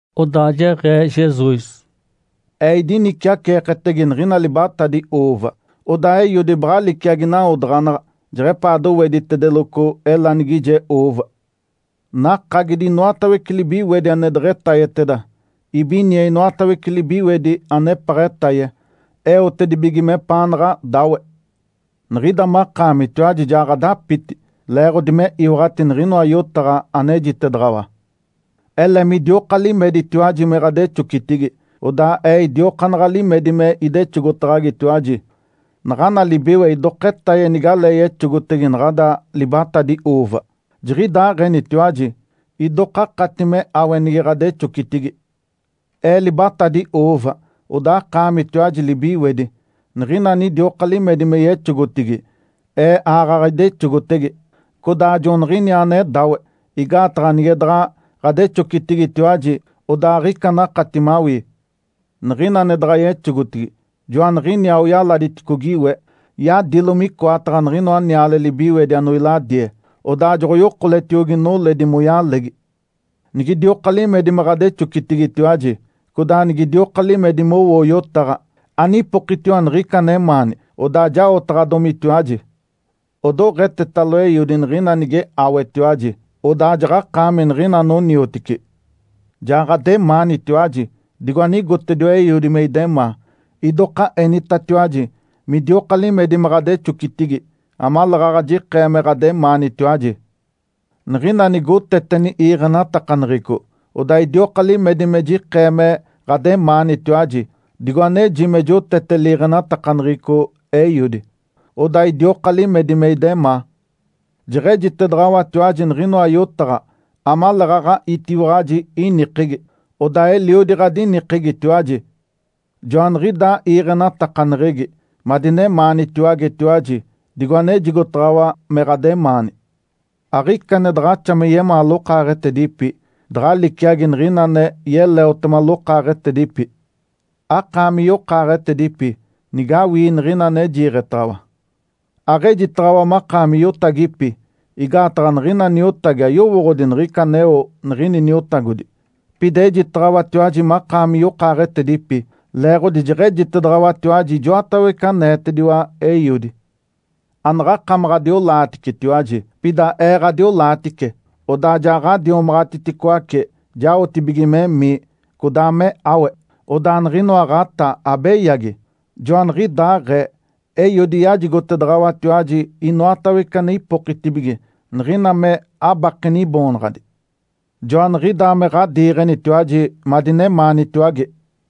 Odaa jeɡ̶ee Jesus, “Ee idiniciaceeketege niɡ̶ina libatadi ‘uuva’. Odaa Eiodi baɡ̶a liciagi nawodaɡ̶anaɡ̶a jeɡ̶epaa doweditedeloco elanigije ‘uuva’. Nakagidi inoatawece libiwedi ane deɡ̶etayeteda. Ibinie inoatawece libiwedi anepaɡ̶a etaye, eotedibige mepaanaɡ̶a dáwe. Niɡ̶ida makaamitiwaji ja ɡ̶adapiti leeɡ̶odi me iwaɡ̶ati niɡ̶inoa yotaɡ̶a anejitedaɡ̶awa. Ele midioka limeditiwaji me ɡ̶adexocitigi, odaa Ee idiokaanaɡ̶a limedi me idexogotaɡ̶agitiwaji. Naɡ̶ana libiwe idoka etaye nigalee yexogotege naɡ̶ada libatadi ‘uuva’. Jiɡ̶idaaɡ̶enitiwaji, idoka akati me áwe nige ɡ̶adexocitigi. Ee libatadi ‘uuva’. Odaa akaamitiwaji libiwedi. Niɡ̶ina anidioka limedi me yexogotigi, Ee aaɡ̶aɡ̶a idexogotege, codaa joaniɡ̶iniaa ane dáwe. Igaataɡ̶a nige daɡ̶a ɡ̶adexocitigitiwaji, odaa aɡ̶ica anakati mawii. Niɡ̶ina ane daɡ̶a yexogotigi, joaniɡ̶iniaa oyaladiticogi we, yadilo micoataɡ̶a niɡ̶inoa niale libiwedi anoiladie, odaa joɡ̶oyokoletiogi noledi moyalegi. Nigidioka limedi me ɡ̶adexocitigitiwaji, codaa nigidioka limedi mowoo yotaɡ̶a, anipokitiwa niɡ̶ica anemaani, odaa jaotaɡ̶adomitiwaji. Odoɡ̶etetalo Eiodi, niɡ̶ina nige áwetiwaji. Odaa jaɡ̶akaami niɡ̶ina anoniotici. Ja ɡ̶ademaanitiwaji digo anigotediwa Eiodi me idemaa. Idoka enitatiwaji midioka limedi me ɡ̶adexocitigi amaleeɡ̶aɡ̶a jikee me ɡ̶ademaanitiwaji. Niɡ̶ina nigoteteni iiɡ̶enatakaneɡ̶eco, odaa idioka limedi me jikee me ɡ̶ademaanitiwaji, digo aneji me jotete liiɡ̶enatakaneɡ̶eco Eiodi, odaa idioka limedi me idemaa. Jeɡ̶ejitedaɡ̶awatiwaji niɡ̶inoa yotaɡ̶a amaleeɡ̶aɡ̶a itiwaɡ̶aji inikegi, odaa eliodi ɡ̶adinikegitiwaji. Joaniɡ̶idaa iiɡ̶enatakaneɡ̶egi, madinemaanitiwagetiwaji, digo anejigotaɡ̶awa me ɡ̶ademaani. Aɡ̶ica ane daɡ̶axa me yemaa lokaaɡ̶etedipi, daɡ̶a liciagi niɡ̶ina ane yeleotema lokaaɡ̶etedipi. Akaami yokaaɡ̶etedipi nigawii niɡ̶ina ane jiiɡ̶etaɡ̶awa. Aɡ̶ejitaɡ̶awa makaami iotagipi, igaataɡ̶a niɡ̶ina niotagi ayowooɡ̶odi niɡ̶ica aneo niɡ̶ini niotagodi. Pida ejitaɡ̶awatiwaji makaami yokaaɡ̶etedipi leeɡ̶odi jeɡ̶ejitedaɡ̶awatiwaji ijoatawece aneetediwa Eiodi. Anaɡ̶akamaɡ̶a adiolaaticetiwaji, pida Ee ɡ̶adiolaatice, odaa ja ɡ̶adiomaɡ̶atiticoace jaotibige memii, codaa me áwe, odaa niɡ̶inoa ɡ̶atá abeyagi. Joaniɡ̶idaaɡ̶ee, Eiodi yajigotedaɡ̶awatiwaji inoatawece ane ipokitibige, niɡ̶ina me abakeni Iboonaɡ̶adi. Joaniɡ̶idaa me ɡ̶adiiɡ̶enitiwaji madinemaanitiwage.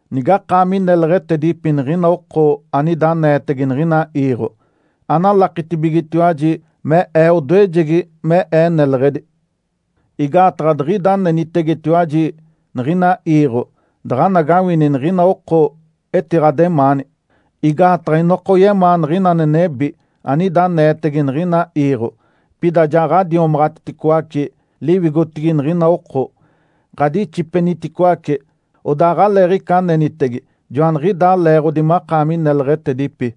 Nigakaami neleɡ̶etedipi niɡ̶ina oko anida aneetege niɡ̶ina iiɡ̶o, analakitibigetiwaji me Ee odoejegi me Ee neleɡ̶edi. Igaataɡ̶a diɡ̶ida anenitegetiwaji niɡ̶ina iiɡ̶o, daɡ̶anagawini niɡ̶ina oko etiɡ̶ademaani, igaataɡ̶a inoka oyemaa niɡ̶ina ane nebi, anida aneetege niɡ̶ina iiɡ̶o. Pida ja ɡ̶adiomaɡ̶atiticoace liwigotigi niɡ̶ina oko, ɡ̶adixipeniticoace, odaa aɡ̶aleeɡ̶ica anenitege. Joaniɡ̶idaa leeɡ̶odi makaami neleɡ̶etedipi.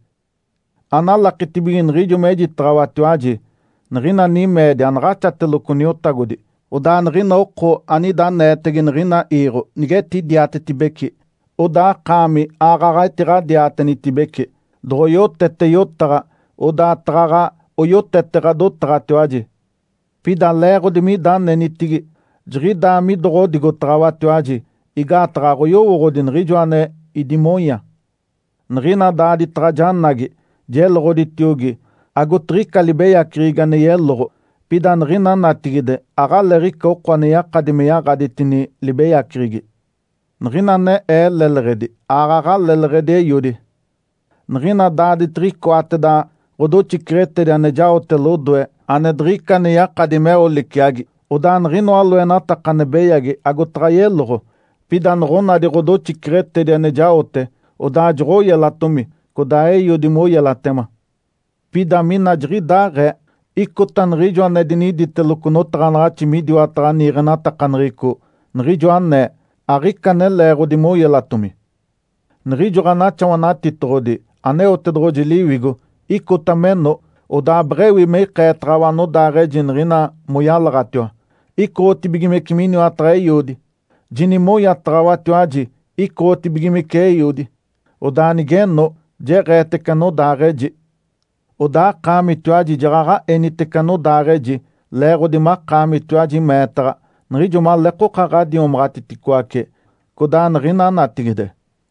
Analakitibige niɡ̶ijo mejitaɡ̶awatiwaji, niɡ̶ina nimeedi anaɡ̶axateloco niotagodi. Odaa niɡ̶ina oko anida aneetege niɡ̶ina iiɡ̶o nigetidiatetibeci, odaa akaami aaɡ̶aɡ̶a etiɡ̶adiatenitibece. Doɡ̶oyotete yotaɡ̶a, odaa taɡ̶aɡ̶a oyotete ɡ̶adotaɡ̶atiwaji. Pida leeɡ̶odi mida anenitigi jiɡ̶idaa midoɡ̶odigotaɡ̶awatiwaji, igaataɡ̶a aɡ̶oyowooɡ̶odi Niɡ̶ijoa ane idimonya. Niɡ̶ina daaditaɡ̶a janagi, jeloɡ̶oditiogi, agotiɡ̶ica libeyaceɡ̶egi ane yeloɡ̶o. Pida niɡ̶ina natigide aɡ̶aleeɡ̶ica oko ane yakadi me yaɡ̶aditini libeyaceɡ̶egi. Niɡ̶ina ane Ee leleɡ̶edi, aaɡ̶aɡ̶a leleɡ̶edi Eiodi. Niɡ̶ina daaditiɡ̶icoateda ɡ̶odoxiceɡ̶etedi ane jaote lodoe, ane diɡ̶ica ane yakadi meo liciagi, odaa niɡ̶inoa loenataka ane beyagi agotaɡ̶a yeloɡ̶o. Pida noɡ̶onadi ɡ̶odoxiceɡ̶etedi ane jaote, odaa joɡ̶oyelatomi, codaa Eiodi moyelatema. Pida mina jiɡ̶idaaɡ̶ee, icota niɡ̶ijo ane diniditeloco notaɡ̶anaɡ̶axi midiwataɡ̶a niiɡ̶enatakaneɡ̶eco, niɡ̶ijo anee, ‘Aɡ̶ica ane leeɡ̶odi moyelatomi’. Niɡ̶ijo Ǥanaxawanatitoɡ̶odi, Aneotedoɡ̶oji Liwigo, icota meno, odaa beɡ̶ewi me ikeetaɡ̶awa anodaaɡ̶eji niɡ̶ina moyalaɡ̶atiwa, icoɡ̶otibigimece miniwataɡ̶a Eiodi. Jinimonyataɡ̶awatiwaji, icoɡ̶otibigimece Eiodi. Odaa nigeno, jeɡ̶eetece anodaaɡ̶eji. Odaa akaamitiwaji jaɡ̶aɡ̶a enitece anodaaɡ̶eji, leeɡ̶odi makaamitiwaji meetaɡ̶a, niɡ̶ijo maleekoka ɡ̶adiomaɡ̶atiticoace, codaa niɡ̶ina natigide.